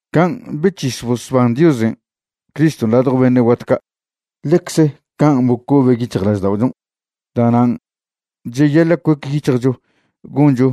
Can' bec̱his bosban Diosen' Criston' ladjo beṉe' guat ca', ḻecze can' bocobe' yic̱hjlažda'ochon'. Da'nan' cheyaḻa' cuec yic̱hjcho goncho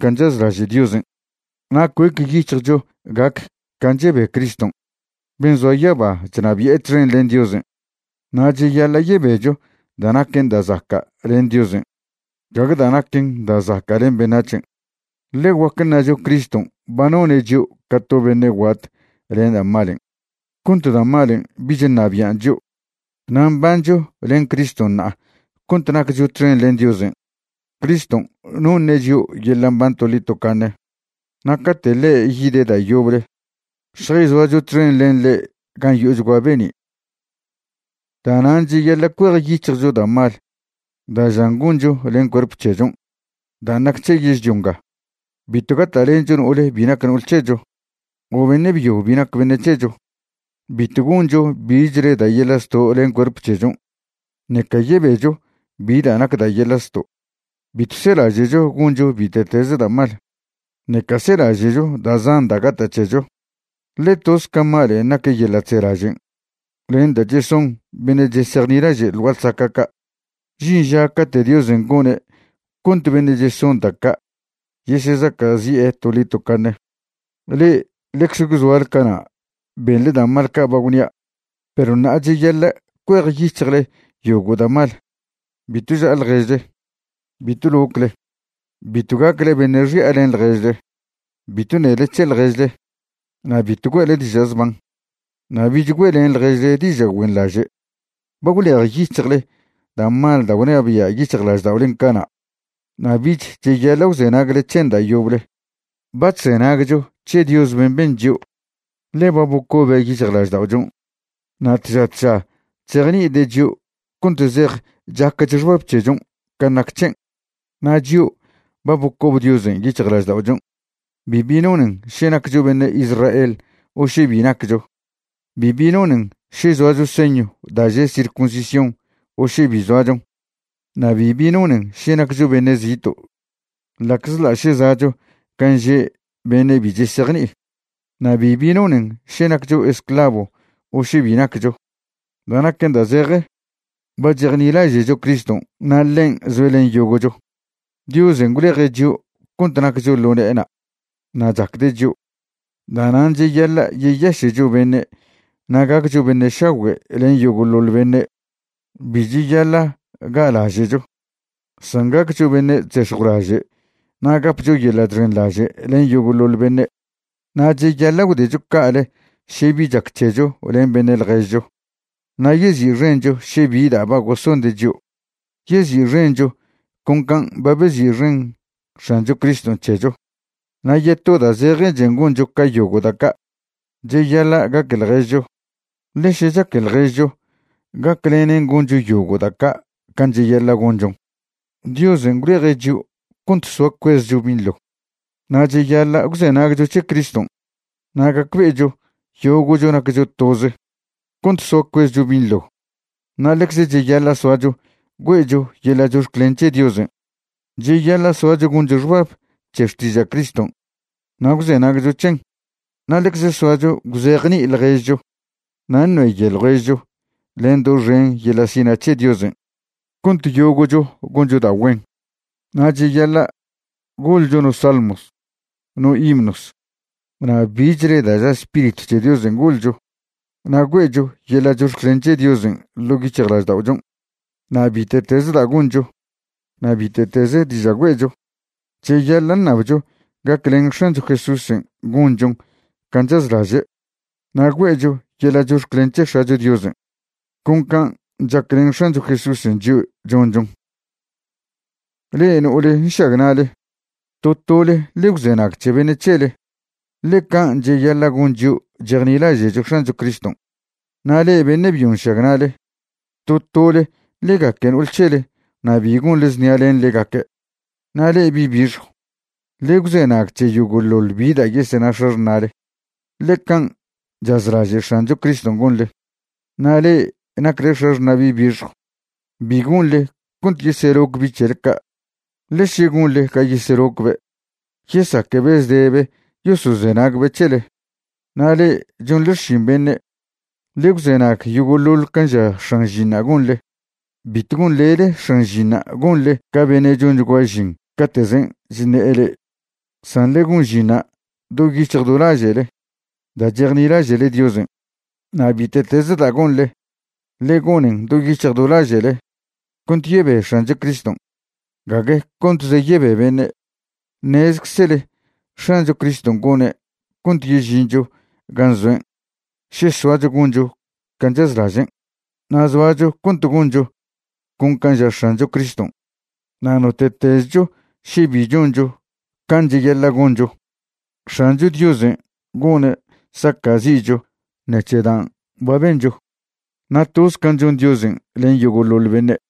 can' chazlaže' Diosen' na' cuec yic̱hjcho gac can' chebe Criston' ben' zoa yaba chnabi'e txen len Diosen'. Na' cheyaḻa' yebecho da' naquen da' zaca' len Diosen', gague da' naquen da' zaca' len beṉac̱hen'. Ḻe guac ṉacho Criston' ba none' chio' ca to beṉe' guat len da' malen' cont da' malen' bich ṉabian' chio', na' mbancho len Criston' ṉa'a cont naccho txen len Diosen'. Criston' noṉe' chio' yeḻa' mban toḻi tocaṉe. Na' cate' ḻe' yide' da' yoble, šjayzoacho txen len ḻe' gan' yo'ochgua be'ni'. Da'nan' cheyaḻa' cuejyic̱hjcho da' mal da' žan goncho len cuerp c̱hechon' dan' nac c̱he yežlio nga. Bitw gata'lencho no'ole bi nac no'ol c̱hecho o beṉe' byo bi nac beṉe' c̱hecho. Bitw goncho bichle da' yeḻa' zto' len cuerp c̱hechon' ṉeca yebecho bi da' nac da' yeḻa' zto'. Bitw selaže'cho goncho bite'teze da' mal, ṉeca selaže'cho da' zan da' gata' c̱hecho, ḻe toz ca malen' nac yeḻa' chzelažen' len da' cheson beṉe' chesejnilaže' ḻ gua'a ḻsaca' ca'. Žin ža cate' Diosen' gone' cont beṉe' cheson da' ca' yesezaca'zi'e toḻi tocaṉe. Le'e ḻecze gwzoale cana' benḻe da' mal ca' ba gwnia'. Perw ṉa'a cheyaḻa' cuejyic̱hjle yogo' da' mal. Bitw ža'a ḻježle, bitw locle, bitw gacle beṉe' xi'a len ḻježle, bitw ṉele c̱he ḻježle, na' bitw güe'le diža' zban. Na' bich güe'len ḻježle diža' güenḻaže'. Ba gwlejyic̱hjle da' mal da' gwnabia' yic̱hjlažda'olen' cana' na' bich cheyaḻa' gwzenagle c̱hen da' yoble. Ba chzenagcho c̱he Dios ben' ben chio', ḻe ba bocobe' yic̱hjlažda'ochon'. Na' tža tža chzejni'ide' chio' cont zej chacch xbab c̱hechon' can' nac c̱hen'. Na' chio' ba bocob Diosen' yic̱hjlažda'ochon', bibi nonen še naccho beṉe' Israel o še bi naccho. Bibi nonen še zoacho señw da' že' circuncisión o še bi zoachon, na' bibi nonen še naccho beṉe' zito', ḻa'czḻa' še za'cho gan' že' beṉe' bi chesejni'i, na' bibi nonen še naccho esclavo o še bi naccho. Da' naquen da' zeje, ba chejnilaže'cho Criston' na' ḻen' zoe' len yogo'cho. Diosen' gwleje' chio' cont naccho ḻo ne'ena' na' chacde' chio'. Da'nan' cheyaḻa' yeyaše'cho beṉe' na' gaccho beṉe' šagüe' len yogo'ḻoḻ beṉe'. Bi cheyaḻa' ga'laže'cho, san gaccho beṉe' chzex̱jwlaže' na' gapcho yeḻa' chxenḻaže' len yogo'ḻoḻ beṉe'. Na' cheyaḻa' gwdecho ca'ale še bi chac c̱hecho len beṉe' ḻježcho na' yezi'xencho še bi da' ba gosonde' chio', yezi'xencho con can' ba bezi'xen X̱ancho Criston' c̱hecho. Na' yeto da' zejechen goncho ca yogo' da' ca', cheyaḻa' gaque ḻježcho, ḻe še chaque ḻježcho gaclenen goncho yogo' da' ca' can' cheyaḻa' gonchon. Diosen' gwleje' chio' cont soa cuezcho binḻo, na' cheyaḻa' gwzenagcho c̱he Criston' na' gacbe'echo yogo'cho naccho toze cont soa cuezcho binḻo. Na' ḻecze cheyaḻa' soacho güe'cho yeḻa' chox̱clen c̱he Diosen'. Cheyaḻa' soacho goncho xbab c̱he xtiža' Criston' na' gwzenagcho c̱hen, na' ḻecze soacho gwzejni'i ḻježcho na' ṉeyoe ḻježcho len doxen yeḻa' sina' c̱he Diosen' cont yogo'cho goncho da' güen. Na' cheyaḻa' goḻcho no salmos, no himnos, na' bichle da' ža Spiritw c̱he Diosen' goḻcho, na' güe'cho yeḻa' chox̱clen c̱he Diosen' ḻo' yic̱hjlažda'ochon'. Na' bite'teze da' goncho na' bite'teze diža' güe'cho, cheyaḻa' ṉabcho gaclen X̱ancho Jesúsen' gonchon can' chazlaže', na' güe'cho yeḻa' chox̱clen c̱he X̱acho Diosen' con can' chaclen X̱ancho Jesúsen' chio' chonchon'. Le'e no'ole nšagna'le, to tole ḻe gwzenag c̱he beṉe' c̱hele, ḻe can' cheyaḻa' gon chio' chejnilaže'cho X̱ancho Criston'. Na' le'e beṉe' byo nšagna'le, to tole ḻe gaque no'ol c̱hele na' bi gonḻe znia len ḻegaque'. Na' le'e bi' bixjw, ḻe gwzenag c̱he yogo'ḻoḻ bi da' yesena x̱axṉa'le, ḻe can' chazlaže' X̱ancho Criston' gonḻe. Na' le'e nacle x̱axṉa' bi' bixjw, bi gonḻe cont yeseloc bi' c̱hele ca', ḻe še gonḻe ga yeselocbe', yesaquebe' zdebe yosozenagbe' c̱hele. Na' le'e chonḻe xšin beṉe', ḻe gwzenag yogo'ḻoḻ can' ža x̱an žinṉa' gonḻe. Bitw gonḻele x̱an žinṉa' gonḻe ca beṉe' chonchgua žin cate'zen' chṉe'e le'e, san ḻe gon žinṉa' do yic̱hj do laže'le da' chejnilaže'le Diosen'. Na' bite'teze da' gonḻe, ḻe gonen do yic̱hj do laže'le cont yebe X̱ancho Criston', gague contze yebe beṉe'. Ṉezczele X̱ancho Criston' gone' cont yežincho gan' zoen' še soacho goncho can' chazlažen'. Na' zoacho cont goncho con can' ža X̱ancho Criston'. Na' note'tezcho še bi choncho can' cheyaḻa' goncho, X̱ancho Diosen' gone' saca'zi'cho ṉec̱he dan' ba bencho. Na' toz can' chon Diosen' len yogo'ḻoḻ beṉe'.